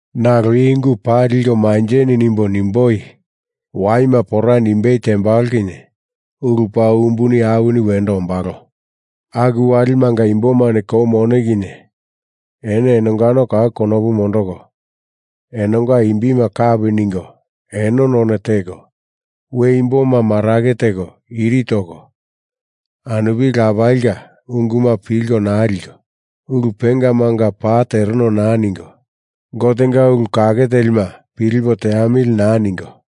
Nalo i ungu paa liko manjeni nimbo nimboi: Waima pora nimbei tembalo kinye ulu paa umbuni awini wendo ombalo. Aku walimanga imbomani kou mone kinye eno enongano kau konopu mondoko, enonga imbima kapi ningo eno none teko, we imboma marake teko iri toko, anupili lapalinga unguma pilko naa liko, ulu pengamanga paa tereno naa ningo, Gotenga ulu kake telima pilipo teamili naa ningo,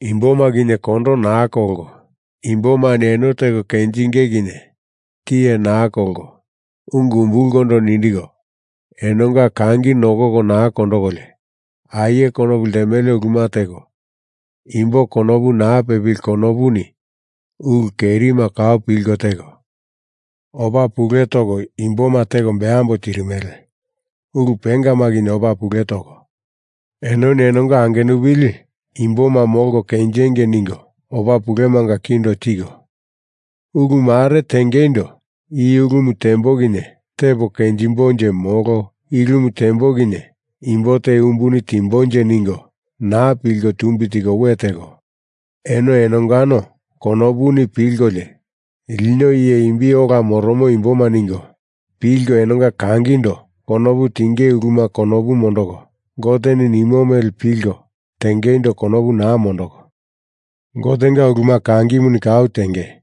imboma kinye kondo naa kolko, imbomani eno teko kenjinge kinye tiye naa kolko, ungu umbulkondo nindiko enonga kangi nokoko naa kondokolio, aie konopu ltemele uluma teko, imbo konopu naa pepili konopuni ulu kerima kau pilko teko, opa pule toko imboma teko beambo tirimele, ulu pengama kinye opa pule toko, enoni enonga angenupili imboma molko kenjengei ningo opa pulemanga kindo tiko, ulu mare tengeindo i ulumu tembo kinye tepo kenjimbonje molo i ulumu tembo kinye imbo te umbuni timbonje ningo naa pilko tumbi tiko we teko, eno enongano konopuni pilkolio lino iye imbi ola moromo imboma ningo pilko enonga kangindo konopu tinge uluma konopu mondoko Goteni nimo mele pilko tengeindo konopu naa mondoko, Gotenga uluma kangimuni kau tenge,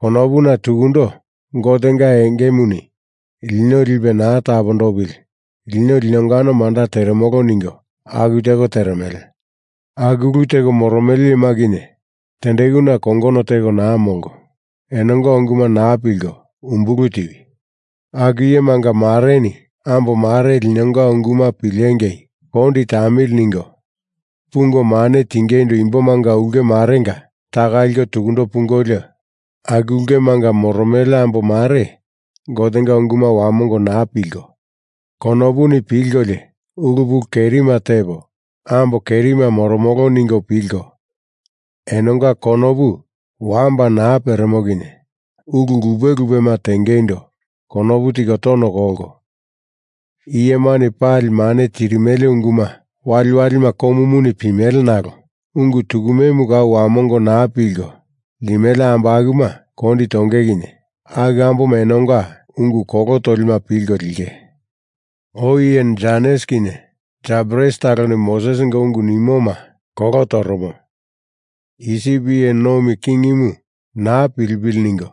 konopuna tukundo Gotenga engemuni lino lipe naa tapondopili lino linongano manda teremolo ningo aku teko teremele. Aku ulu teko moromele iyema kinye tendekuna kongono teko naa molko enonga unguma naa pilko umbulu tiwi. Aku iyemanga mareni ambo mare linonga unguma pilengei kondi tamili ningo pungo mane tingeindo imbomanga ulke marenga taka liko tukundo pungolio, aku ulkemanga moromele ambo mare Gotenga unguma wamongo naa pilko, konopuni pilkolio ulu pulu kerima tepo ambo kerima moromolo ningo pilko, enonga konopu wamba naa peremo kinye ulu lupe lupema tengeindo konopu tiko tono kolko, iyemani pali mane tirimele unguma waliwalima komuni pimele nalo ungu tukumemu kau wamongo naa pilko limele ambo akuma kondi tonge kinye aku amboma enonga ungu kolo tolima pilko linge. Oi iye Janes kinye Jambres taloni Mosesinga ungu nimoma kolo toromo, Isip iye nomi kingimu naa pilipili ningo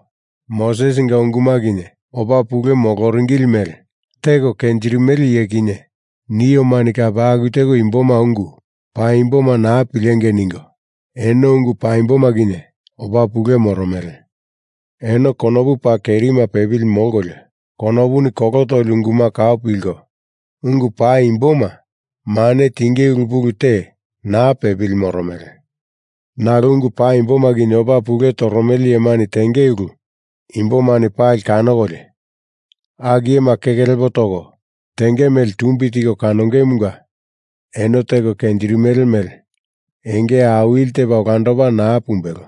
Mosesinga unguma kinye opa pule moloringili mele teko kenjirimele iye kinye, niomani kape aku teko imboma ungu paimboma naa pilengei ningo eno ungu paimboma kinye opa pule moromele. Eno konopu paa kerima pepili molkolio konopuni kolo toli unguma kau pilko, ungu paimboma mane tinge ulu pulu te naa pepili moromele. Nalo ungu paimboma kinye opa pule toromele iyemani tenge ulu imbomani pali kanokolio, aku iyema keke lepo toko tenge mele tumbi tiko kanongemunga eno teko kenjirimele mele enge awili tepa olandopa naa pumbelo.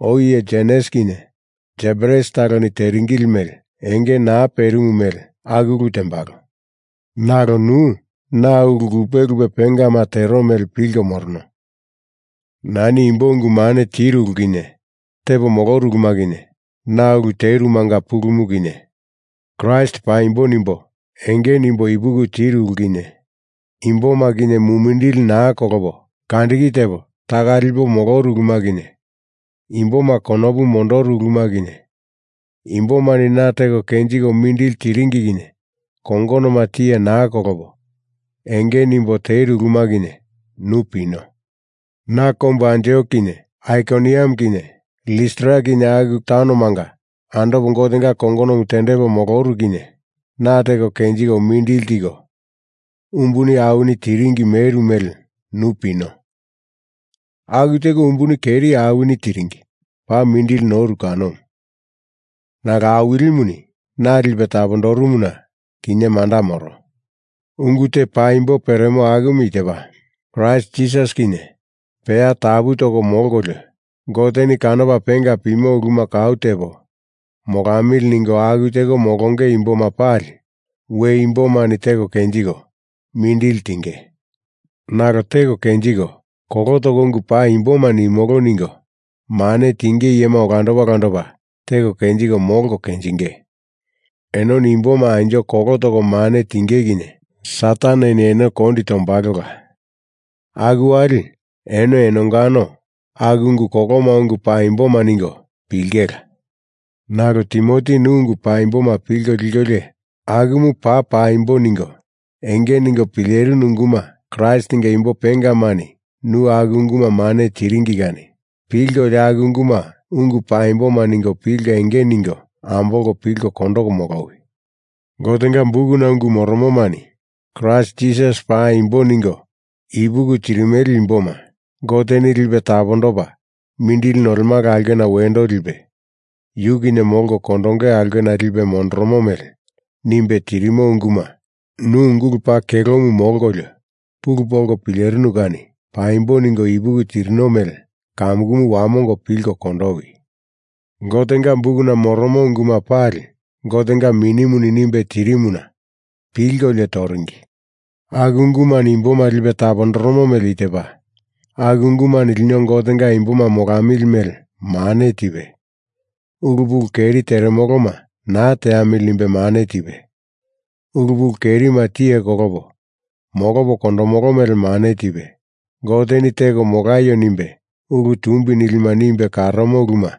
Oi iye Janes kinye Jambres taloni teringili mele enge naa perimu mele aku ulu tembalo. Nalo nu na ulu lupe lupe pengama tero mele pilko morono. Nani imbo ungu mane tiru ulu kinye, tepo moloru uluma kinye, na ulu terumanga pulumu kinye, Kraist paimbo nimbo enge nimbo ipuki tiru ulu kinye, imboma kinye mumindili naa kolopo kandiki tepo taka lipo moloru uluma kinye, imboma konopu mondoru uluma kinye, imbomani na teko kenjiko mindili tiringi kinye kongonoma tiye naa kolopo enge nimbo teru uluma kinye, nu pino. Na kombu Antiok kinye Aikoniam kinye Listra kinye aku taunomanga andopo Gotenga kongonomu tendepo moloru kinye na teko kenjiko mindili tiko umbuni awini tiringi meru mele nu pino. Aku teko umbuni keri awini tiringi paa mindili noru kanomu. Nalo Awilimuni na lipe tapondorumuna kinye manda moro. Ungu te paimbo peremo akumu i tepa, Kraist Jisasi kinye peya tapu toko molkolio Goteni kanopa penga pimo uluma kau tepo molamili ningo aku teko molonge imboma pali we imbomani teko kenjiko mindili tinge. Nalo teko kenjiko, kolo toko ungu paimboma nimolo ningo mane tinge iyema olandopa olandopa teko kenjiko molko kenjinge. Enoni imboma anjo kolo toko mane tinge kinye Sataneni eno kondi tombalola, aku wali eno enongano aku ungu koloma ungu paimboma ningo pilingela. Nalo Timoti nu ungu paimboma pilko likolio akumu paa paimbo ningo enge ningo pilerinu unguma Kraistinga imbo pengamani nu aku unguma mane tiringi kani pilkolio aku unguma ungu paimboma ningo pilko enge ningo ambolko pilko kondoko molowi. Gotenga bukuna ungu moromomani Kraist Jisasi paimbo ningo ipuki tirimele imboma Goteni lipe tapondopa mindili nolemala aulkena wendo lipe yu kinye molko kondonge aulkena lipe mondoromo mele nimbe tirimo unguma nu ungulu paa kelomu molkolio pulu polko pilerinu kani paimbo ningo ipuki tirino mele kamukumu wamongo pilko kondowi. Gotenga bukuna moromo unguma pali Gotenga Minimuni nimbe tirimuna pilkolio toringi. Aku ungumani imboma lipe tapondoromo mele i tepa, Aku ungumani lino Gotenga imboma molamili mele mane tipe, ulu pulu keri teremoloma naa teamili nimbe mane tipe, ulu pulu kerima tiye kolopo molopo kondomolo mele mane tipe, Goteni teko molaio nimbe, ulu tumbi nilima nimbe karomo uluma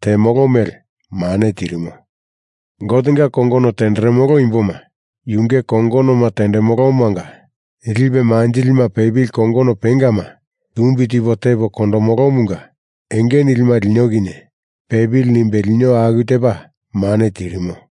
temolo mele mane tirimo. Gotenga kongono tenderemolo imboma yunge kongonoma tendemolomanga lipe manjilima pepili kongono pengama tumbi tipo tepo kondomolomunga enge nilima lino kinye pepili nimbe lino aku tepa mane tirimo.